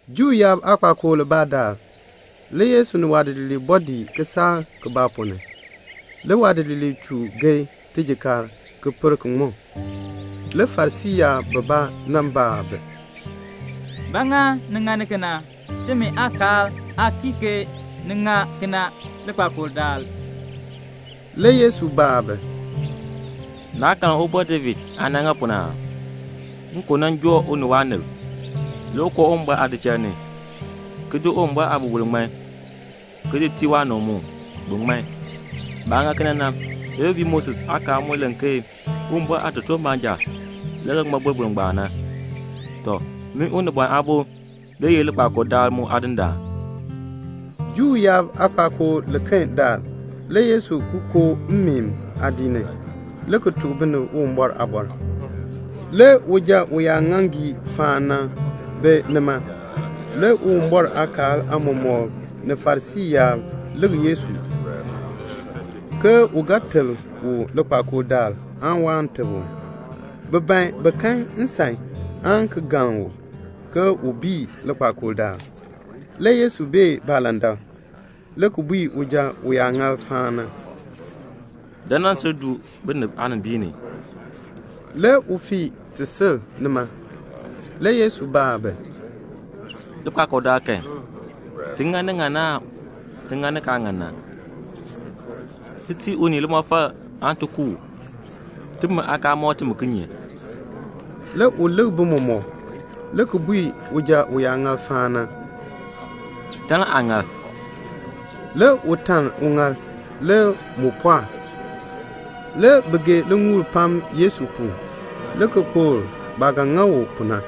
Juu yaab aakpakool libaa daal, le Yesu ni waadidiliib bɔɔ dii kisaak ponn ni. Le waadidiliib chur geei tijikaar ki per ki ŋmɔ. Le Farisii yaab bibaa nan baa bi, "Ba ŋa ni ŋani kena? Timi aakaal aa kii ke ni ŋa kena likpakool daal." Le Yesu baa bi, "Naa karn Ubɔr David aah nan ŋa pu na aa? Nkon nan joo u ni waanib. Le u koo Uwumbɔr aadichal ni, ki di Uwumbɔr aaboroboro, ki di ŋman, ki di tii waanib mu, bin ŋman. Baah ŋa kena na, le bi bii Moses aakaal mu len ke Uwumbɔr aatotoortiib baanja le ga ŋmɔ boroboro ngbaan. "Tɔ, min Unibɔn Aabo le ye likpakool daal mu Aadindaan." Juu yaab aakpakool liken daal, le Yesu ki koo mmeen aadiik ni, le ki tuk binib Uwumbɔr aaliin. Le uja uyaaŋaaŋgii faan na bi nima. Le Uwumbɔr aakaal aamɔmɔkb ni Farisii yaab lik Yesu, ke u ga teb u likpakool daal aan waan teb u. Bi ban bi kan nsan aan ki galn u, ke u bii likpakool daal. Le Yesu bee baalandak. Le u bui uja uyaaŋaal faan na, "Dan nan sil du binib aanimbiin ni." Le u fii ti sil nima. Le Yesu baa bi, "Likpakool daal kan, ti ŋa ni ŋan na aan ni kaa ŋan na? Ti tii unii limɔfal aan ti ku u? Timi aakaal mɔk timi kinye?" Le u lik bi mɔmɔk, le ki bui uja uyaaŋaal faan na, "Taln aaŋaal." Le u taln uŋaal. Le mu pɔɔk. Le bi gee liŋuul pam Yesu pu, le ki kpokl baah ga ŋa u pu na.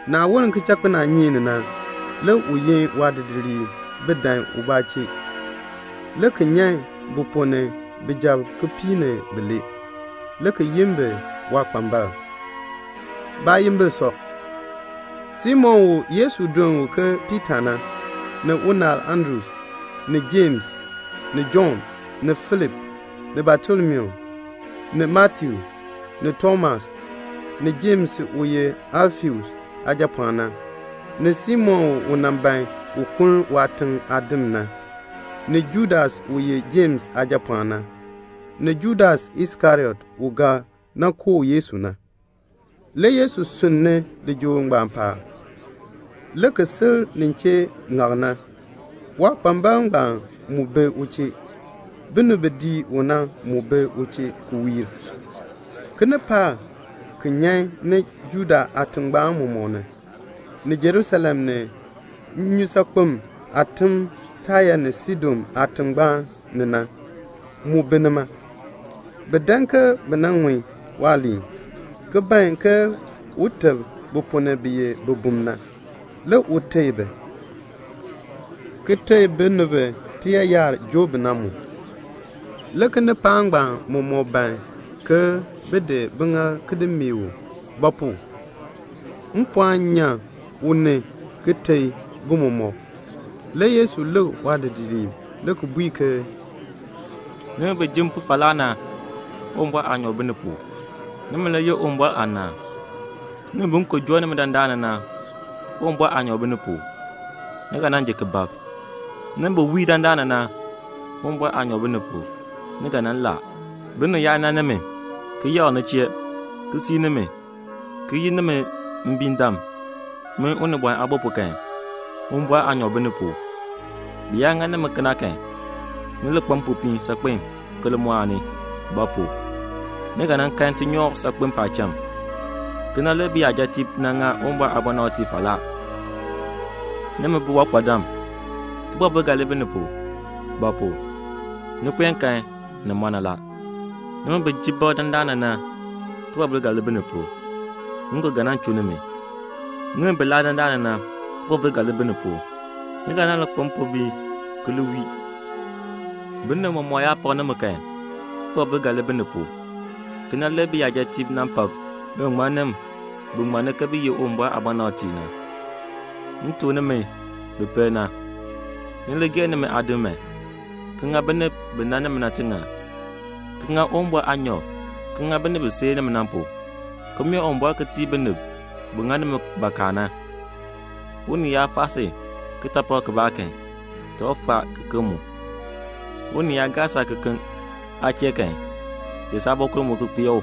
Le ni woln kichakpinaanyeek ni, le u yin waadidiliib bin dan u chee, le ki nyan bi ponn ni bijab kipiik ni bilee, le ki yin bi ke waakpambalb. Baayimbil sɔ; Simon u Yesu duln u ke Piita na, ni unaal Andru; ni Jems, ni Jɔnn, ni Filip, ni Batolomiu, ni Matiu, ni Tomas, ni Jems u ye Alfeus aajapɔɔn na; ni Simon u nan ban un kuln waatiŋ aadim na; ni Judas u ye Jems aajapɔɔn na; ni Judas Iskariot u ga nan kooh Yesu na. Le Yesu sunn ni lijool ngbaan paab, le ki sil nin chee ŋak na. Waakpambalb ngbaan mu dii ni. Binib bi dii u na mu bi u chee ki wiir. Kinipaak bi nyan ni Judea aatingbaan mɔmɔk ni, ni Jerusalem, ni nnyusaakpem aatim Taya ni Saidon aatingbaan ni na, mu bi nima. Bi dan ke bi nan ŋun waaliin, ki ban ke un teb bi ponn ni bi ye bibum na. Le u teei bi, ki teei binib bi tiyaayar joo bi na mu. Le kinipaak ngbaan mɔmɔk ban ke bin di biŋaal ki di meeh u; ba pu? mpɔɔn nyan u ni, ki teei bi mɔmɔk. Le Yesu lik waadidiliib le ki bui ke "Nimi bi ji m pu falaa na, Uwumbɔr aanyoor bi ni pu; nimi le yeh Uwumbɔr aanaan. "Nimi bi nkon joo nimi dandana na, Uwumbɔr aanyoor bi ni pu; ni ga nan ji ki bab. "Nimi bi wii dandana na, Uwumbɔr aanyoor bi ni pu; ni ga nan laa. "Binib yaa nan nimi, ki yakr ni chee, ki sii nimi, ki yi nimi mbiindam, min Unibɔn Aabo pu kan, Uwumbɔr aanyoor bi ni pu. Bi yaa ŋa nimi kena kan, ni li kpa mpopiin saakpen ki li mɔɔni; ba pu? ni ga kan tinyoor saakpen paacham. Kena le biyajatiib nan ŋa Uwumbɔr aabɔnabtiib falaa. "Nimi biwankpadam, tibɔbil ga li bi ni pu; ba pu? ni puen kan ni mɔ na la. "Nimi bi ji bab dandana na, tibɔbil ga li bi ni pu. Nkon ga nan chuu nimi. "Nimi bi laa dandana na, tibɔbil ga li bi ni pu. Ni ga nan li kpa mpombiin ki li wii. "Binib mɔmɔk yaa pak nimi kan, tibɔbil ga li bi ni pu. Kena le biyajatiib nan pak biŋmaŋmannim bi ŋmann ke bi ye Uwumbɔr aabɔnabtiib na." "M tuk nimi bi pel na, ni li gee nimi aadim man, ki ŋa binib bi nan nimi na tiŋann, ki ŋa Uwumbɔr aanyoor ki ŋa binib bi seei nimi na pu, ki mee Uwumbɔr ki tii binib bi ŋa nimi bakaa na. Unii yaa faa si kitaapak kibaa kan, cha u faa kiken mu. Unii yaa gaa saakekeln aa chee kan, di saabɔkul mu ki kpee u.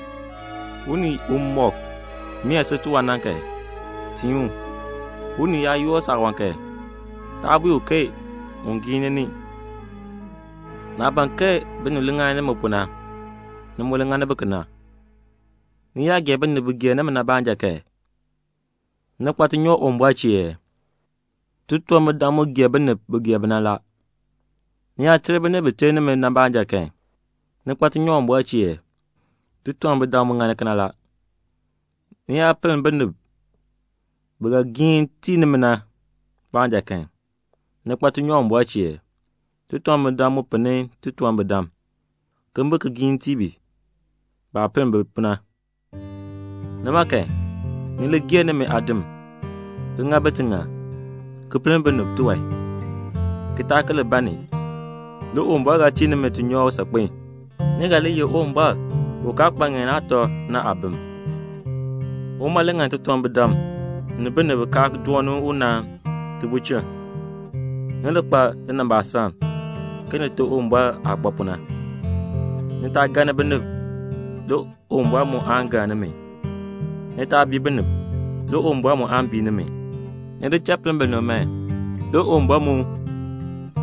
Unii umɔk mee si tiwan ni na, tiin u. Unii yaa yoor saawan kan, taa bui u ke un giini ni. Naah ban ke binib li ŋa nimi pu na, ni mu li ŋani bi kena. "Ni yaa gee binib bi gee nimi na baanja kan, ni kpa tinyoor Uwumbɔr chee ee? Titunwambirdam mu gee binib bi gee bi na la. Ni yaa ter binib bi ter nimi na baanja kan, ni kpa tinyoor Uwumbɔr chee ee? Titunwambirdam mu ŋani kena la. Ni yaa pinn binib bi ga giin tii nimi na baanja kan, ni kpa tinyoor Uwumbɔr chee ee? Titunwambirdam mu pinni titunwambirdam, ke bin ki giin ki tii bi baah pinn bi pu na. Nimi, ni li gee nimi aadim, ki ŋa bi tiŋann, ki pinn binib tiwan, ki taa ki li ban ni. Le Uwumbɔr ga tii nimi tinyoor saakpen. Ni ga li ye Uwumbɔr u kaa kpa ŋeen aatɔ na aabim. Uma le ŋani titunwambirdam ni binib bi kaa dooni u na tibulchin. Ni li kpa linimbaasaln ke Nite Uwumbɔr aah kpa pu na." "Ni taa galni binib, le Uwumbɔr mu aan galn nimi. Ni taa bii binib, le Uwumbɔr mu aan bii nimi. Ni di cha pinn binib man, le Uwumbɔr mu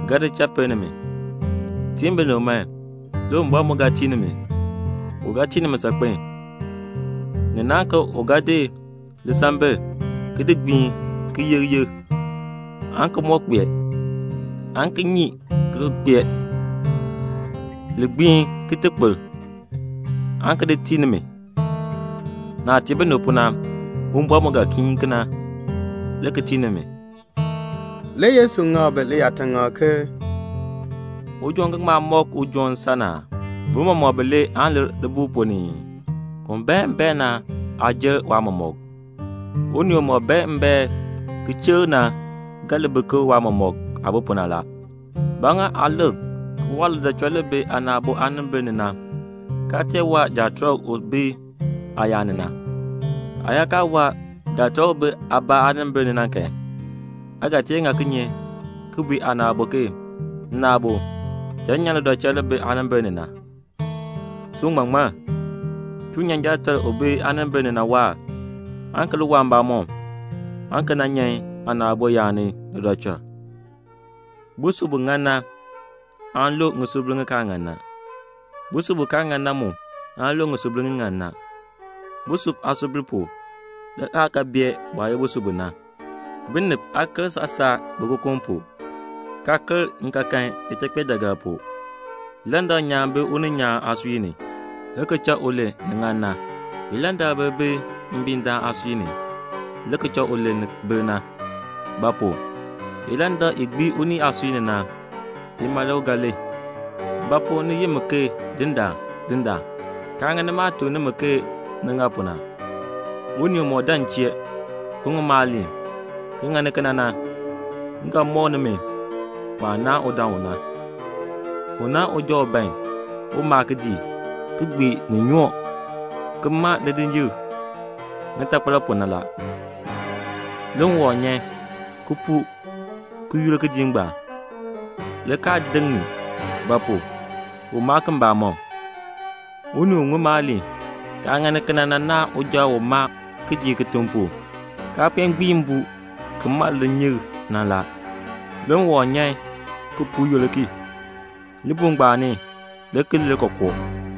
ga di cha pinn nimi. Tiin binib man, le Uwumbɔr mu ga tii nimi. U ga tii nimi saakpen. Ni naahn ke u ga di lisambil, ki di gbiin, ki yek yek, aan ki moo kpee, aan ki nyii ki ki kpee, li gbii ki kpir, aan ki di tii nimi. Naah tii binib pu na, Uwumbɔr mu ga giin kena, le ki tii nimi." Le Yesu ŋak bi liyaataŋakl ke, "Ujoon ga ŋma mɔk ujoon nsan aa? Bi mɔmɔk bilee aan lir libuul ponn ni ii? Un bae mbaen na aa jer waatiicha. Unii umɔk bae mbaen ki chikr na ga li bi ke waatiicha aah bi pu na. "Ba ŋa aa lik ki waa lidɔchɔl li bi aana aabo aanimbil ni na, kaa tee waa jaatɔlk u bi aayaan ni na? Aa yaa kaa waa jaatɔlk u bi aa mamaŋ aanimbil ni na kan, aa ga tee ŋa kinye ki bui aana aabo ke 'Nna aabo, cha m nyan lidɔchɔl li bi aanimbil ni na?' Sin uŋmaŋmann, chuu nyan jaatɔlk u bi aanimbil ni na waahr, aan ki li waa mbamɔm, aan ki nan nyan aana aabo yaan ni lidɔchɔl." "Busub bu ŋan na aan lu ŋisubil ŋi kaa ŋan na. Busub bu kaa ŋan na mu aan lu ŋisubil ŋi ŋan na. Busub aasubil pu, le aa ga bee bu aah ye busub bu na. Binib aa ker saasaa bikokom ni, kaa ker nkaakan ichakpeejaagar ni. Ilandak nyaan bi uninyaan aasui ni, le ki cha u len ni ŋan na. Ilandakbir bi mbiindaan aasui ni, le ki cha u len ni bir na. Ba pu? ilandak i gbii unii aasui ni na, ima le u ga len." "Ba pu ni yi mi ke 'Dindaan, Dindaan,' kaa ŋani maah tuk nimi ke ni ŋa pu na? Unii umɔk dan m chee, ki ŋun maaliin, ki ŋani kena na, m ga mɔk nimi waah naahn udaan u na. U naahn uja u ban un maa kidiik, ki gbii ni nyoo, le ki maa lidinyikl ŋitakpal pu na. Le ŋwɔm nyan, ki puu ki yur kidiik ngbaan, le kaa deŋ ni; ba pu? u maa ki mbamɔm. Unii u ŋun maaliin, kaa ŋani kena na, u naahn uja u maa kidiik kitiŋ pu, kaa puen gbii mbuu ki maa lidinyikl na. Le ŋwɔm nyan ki puu yur ki. Libuul ngbaan ni le ki lir kookoo."